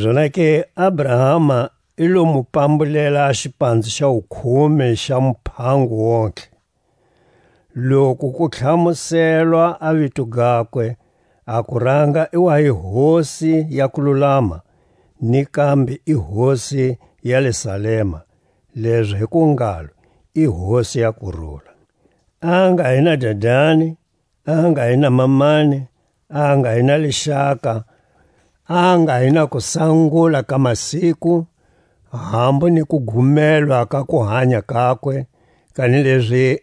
Zonake Abrahama i lo mu pambulela a xipanze xa wukhume xa muphango wontihe. Loku ku tlhamuselwa a vito gakwe, a kuranga i wa hi Hosi ya kululama, ni kambe i Hosi ya le Salema, lezo hi ku ngalo: I Hosi ya kurula. A nga hi na dadani, a nga hi na mamani, a nga hi na lixaka, a nga hi na kusangula ka masiku, hambu ni kugumelwa ka kuhanya kakwe, kanilezi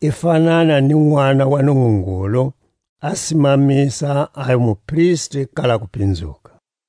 i fanana ni Nʼwana wa Nungungulu, a simamisa a hi mupristi kala kupinzuka.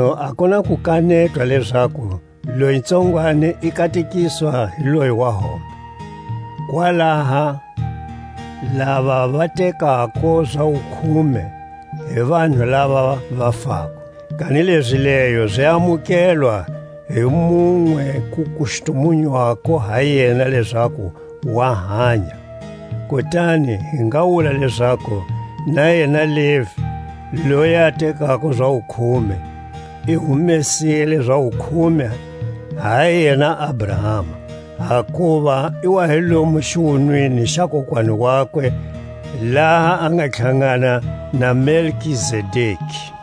Makunu a ku na ku kanetwa lezaku loyi tsongwani i katekiswa hi loyi wa hombe. Kwalaha lava va tekako za wukhume hi vanhu lava va fako, kanilezi leyo zi amukelwa hi munwe ku kustumunywako ha yena lezaku wa hanya. Kutani hi nga wula lezaku na yena Levi, loyi a tekako za wukhume, i humesile za wukhume ha yena Abrahama, hakuva i wa hi lomu xiwunwini xa kokwani wakwe laha a nga tlhangana na Melkizedeki.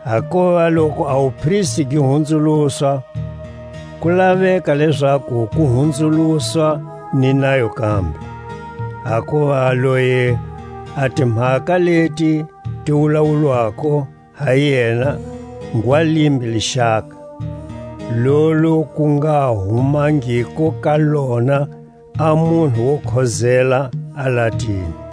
Hakuva loku a wupristi gi hunzuluswa, ku la eka lezaku ku hunzuluswa ni nayo kambe. Hakuva loyi a timhaka leti ti wulawulwako ha yena ngwa limbe lixaka, lolu ku nga humangiko ka lona a munhu wo khozela alatini.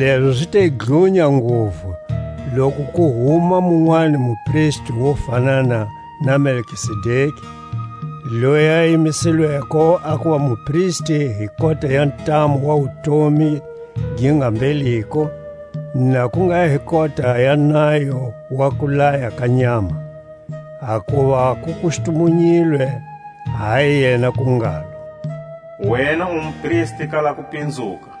Lezo zi te dlunya nguvu loku ku huma munwani mupristi wo fanana na Melkizedeki, loyi a yimisilweko a kuva mupristi hi kota ya ntamu wa wutomi gi nga mbheliko, na ku nga hi kota ya nayo wa kulaya ka nyama. Hakuva ku kustumunyilwe ha yena ku ngalo: Wena u mupristi kala kupinzuka,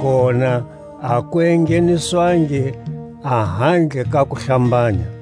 Kona a ku engheniswangi a handle ka kuhlambanya.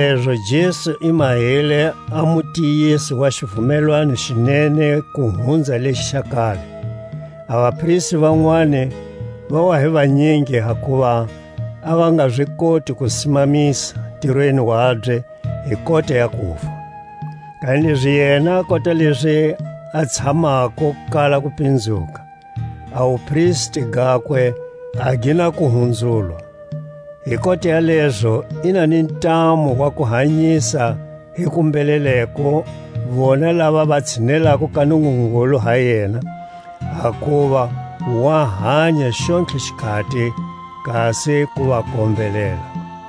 Hizalezo Jesu i mahile a mutiyisi wa xivumelwano xi nene ku hunza lexi xa kale: A vapristi vanwani va wa hi vanyingi, hakuva a va nga zi koti ku simamisa ntirweni wabye hi kota ya kufa; kanilezi yena, kota lezi a tshamako kala kupinzuka, a wupristi gakwe a gi na ku hunzulwa. Hi kota ya lezo i na ni ntamu wa ku hanyisa hi kumbheleleko vona lava va tshinelako ka Nungungulu ha yena, hakuva wa hanya xontlhe xikhati kasi ku va kombelela.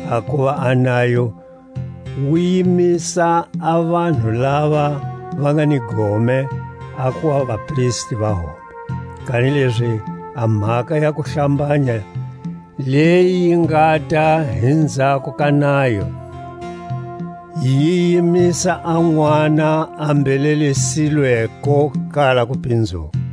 Hakuva a nayo wu yimisa a vanhu lava va nga ni gome a kuva vapristi va hombe; kanilezi a mhaka ya kuhlambanya leyi yi ngata hi nzhako ka nayo, yi yimisa a Nʼwana a mbhelelisilweko kala kupinzuka.